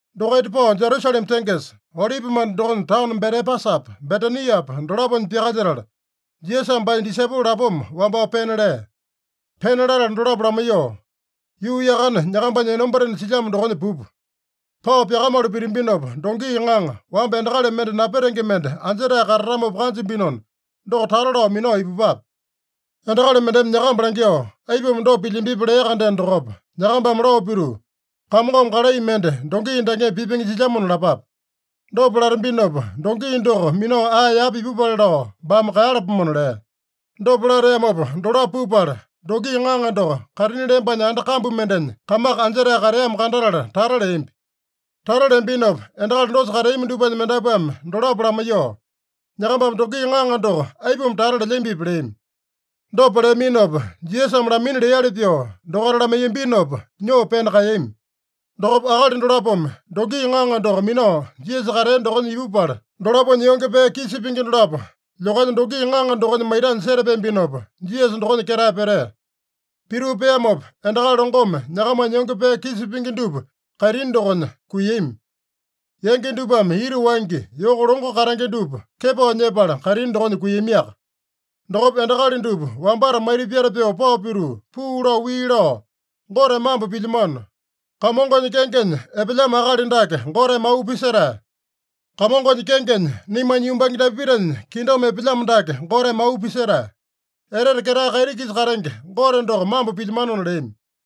Dokaita pao Jerusalema tengesa, Olipimanda dokonya taono Betepasapa, Betaniapa dolaponya pyakalyetala, Jisasame baanya disaipolo lapoma wambao pena lea. Pena latala dolapo lamaiyoo, “Yuu yakane nyakambanya enombatena silyamo dokonya pupa. Pao pyakamalu pitambinopa, dongi ŋaŋa, wamba endakali mende napetenge mende anjetae katatamopa kanjambinona, doko tata lao minao ipupape. Endakali mendeme nyakamba langyoo, ‘Aipuma dopa pilyambipi?’ lea-kandeno dokopa, nyakambame lao pituu, ‘Kamongome kalai mende dongi dakeme pipenge jilyamona’ lapape. Dopa latambinopa, dongi doko minao ae yapa ipupale lao baame kaeyalapomona” lea. Dopa lateamopa dolapo pupala, dongi ŋaŋa doko kaitini lembanya anda kambu mendenya kamaka anjetae kateamo kandatala tata leambi. Tata leambinopa endakali dosa kateami dupanya mendapuame dolapo lamaiyoo, “Nyakambame dongi ŋaŋa doko aipuma tata lelyambipi?” leami. Dopa leaminopa, Jisasame lamaina leali pyoo dokaita lamaiyambinopa, nyoo pena kaeyami. Dokopa akali dolapome dongi ŋaŋa doko minao Jisasa katea dokonya ipupala, dolaponya yonge pee kisa pingi dolapo lyokanya dongi ŋaŋa dokonya maitanya setapeambinopa, Jisasa dokonya ketae petea. Pituu peamopa, endakali longome nyakamanya yonge pee kisa pingi dupa kaitini dokonya kuiyami. Yangi dupame ita wangya, yoko longo katenge dupa kepao nyepala kaitini dokonya kuiyamiaka. Dokopa endakali dupa wambata maita pyata pyoo pao pituu, puu lao wii lao, “Gote mambo pilyamano! Kamongonya kengenya epelyamo akali dake Goteme auu pisetae! Kamongonya kengenya, naimanya yumbange Dapitanya kingdom epelyamo dake Goteme auu pisetae. Etete ketae kaiti-kisa katenge Gote doko mambo pilyamanona” leami.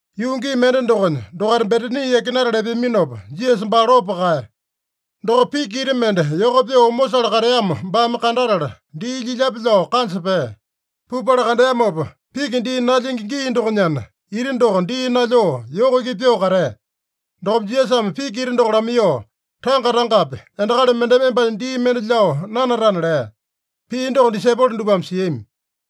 Yuu gii mende dokonya, dokaita Betani yakinatala epeaminopa, Jisasa baa lopo kaeya. Dokopa piki ita mende yoko pyoo omosale kateamo baame kandatala, dii lyilyape lao kanja pea. Pupala kandeamopa, piki dii nalyingi gii dokonyana, ita doko dii nalyoo yoko iki pyoo katea. Dokopa Jisasame piki ita doko lamaiyoo, “Tanga-tangapi endakali mendeme embanya dii mende lyao nanatana” lea. Pii doko disaipolo dupame siami.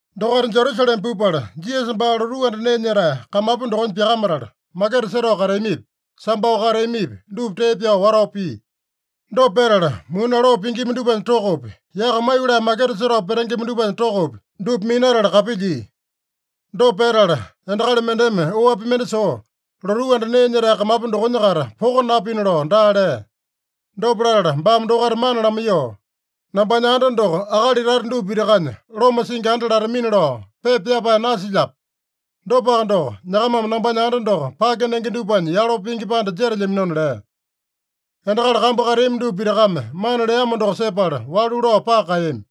Dokaita Jerusalema pupala, Jisasa baa lotuu anda nee nyetae kamapu dokonya pyakamatala, maketa setao kateamipi, sambao kateamipi, dupa tee pyao watao pia. Dopa petala, muni aloo pingima dupanya tokopi, yaka maiyolee maketa setao petengema dupanya tokopi, dupa minatala kapilyia. Dopa petala endakali mendeme oapi mende soo, lotuu anda nee nyetae kamapu dokonya-kaita poko napina lao daa lea. Dopa latala baame dokaita mana lamaiyoo, “ ‘Nambanya anda doko akali tata dupa pitakanya loma singi anda latamina’ lao pepa pyapae nasilyape? Dopaka doko, nyakamame nambanya anda doko pake nenge dupanya yalo pingi panda jetelyaminona” lea. Endakali kambu kateami dupa pitakame mana leamo doko sepala walu lao paka kaeyami.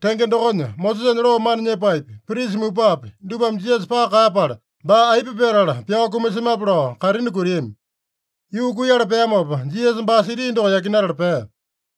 Tenge dokonya, Mosesanya loo mana nyepaepi, prisa mupapi, dupame Jisasa paka kaeyapala, baa aipa petala pyao kumasemape lao kaitini kutiami. Yuu kuiyala peamopa, Jisasa baa siti doko yakinatala pea.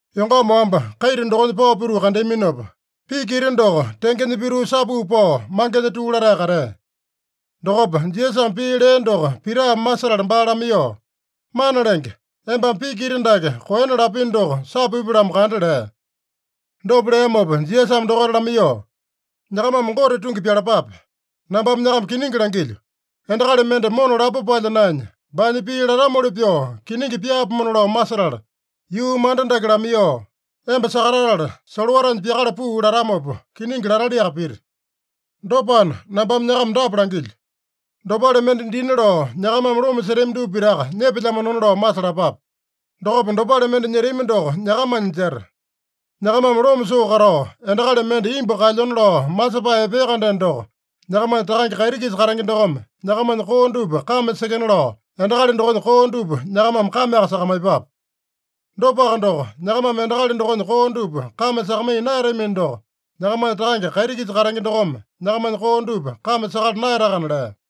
Yongama wamba, kaita dokonya pao pituu kandeaminopa, piki ita doko tengenya pituu sapuu pao, mangenya tuu latae katea. Dokopa Jisasame pii lea doko Pitame masetala baa lamaiyoo, “Mana Lenge, embame piki ita dake koena lapino doko sapupya-lamo kanda” lea. Dopa leamopa Jisasame dokaita lamaiyoo, “Nyakamame Gote tungi pyalapape. Nambame nyakama kiningi langilyo: Endakali mende mona lapo palya naenya, baanya pii latamoli pyoo kiningi pyaapomona lao masetala, yuu manda dake lamaiyoo, ‘Emba sakatatala, solowatanya pyakala puu’ latamopa, kiningi lataliaka pita. Dopana, nambame nyakama dapa langilyo: Dopale mende dina lao nyakamame loma setami dupa pitaka nyepelyamanona lao masalapape. Dokopa dopale mende nyetami doko nyakamanya jeta. Nyakamame loma soo katao, endakali mende imbu kaelyona lao masepae epea-kandeno doko, nyakamanya Takange kaiti-kisa katenge dokome nyakamanya koo dupa kame sekena lao, endakali dokonya koo dupa nyakamame kameaka sakamaiyepape. Dopaka doko, nyakamame endakali dokonya koo dupa kame sakamaiya naeyatamino doko, nyakamanya Takange kaiti-kisa katenge dokome nyakamanya koo dupa kame sakala naeyatakana” lea.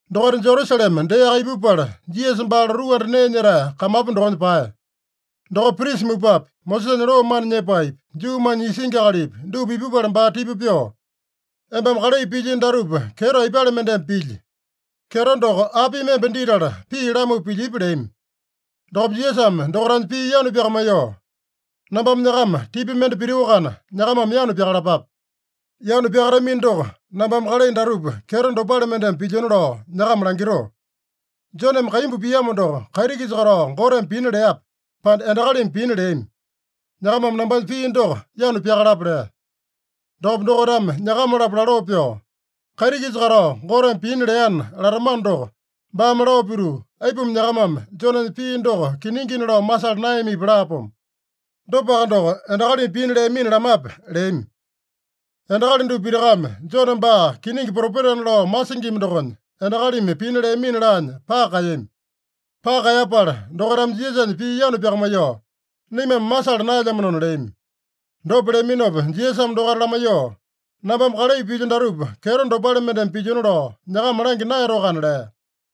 Dokaita Jerusalema deaka ipupala, Jisasa baa lotuu anda nee nyetae kamapu dokonya paeya. Dokopa, prisa mupapi, Mosesanya loo mana nyepaepi, Juumanya isingi akalipi, dupa ipupala baa tipa pyoo, “Embame kalai pilyino datupa kyeto aipale mendeme pilyi? Kyeto doko apimi emba ditala pii lamupa pilyipi?” leami. Dokopa Jisasame dokaitanya pii yanu pyakamaiyoo, “Nambame nyakama tipa mende pitoakana, nyakamame yanu pyakalapape. Yanu pyakatamino doko, nambame kalai datupa kyeto dopale mendeme pilyona lao nyakama langitoo. Joneme kaimbu piamo doko, kaiti-kisa katao Goteme pina leape, pande endakalimi pina leami? Nyakamame nambanya pii doko yanu pyakalapa” lea. Dokopa dokaitame nyakama-lapo laloo pyoo, “ ‘Kaiti-kisa katao Goteme pina leana’ latamano doko, baame lao pituu, ‘Aipuma nyakamame Jonenya pii doko kiningina lao masala naeyamipi?’ laapomo. Dopaka doko, endakalimi pina leamina lamape?” leami. Endakali dupa pitakame Jone baa kiningi propetana lao masingima dokonya, endakalimi pina leamina laanya paka kaeyami. Paka kaeyapala dokaitame Jisasanya pii yanu pyakamaiyoo, “Naimame masala naelyamanona” leami. Dopa leaminopa Jisasame dokaita lamaiyoo, “Nambame kalai pilyo datupa kyeto dopale mendeme pilyona lao nyakama langya naeyatoakana” lea.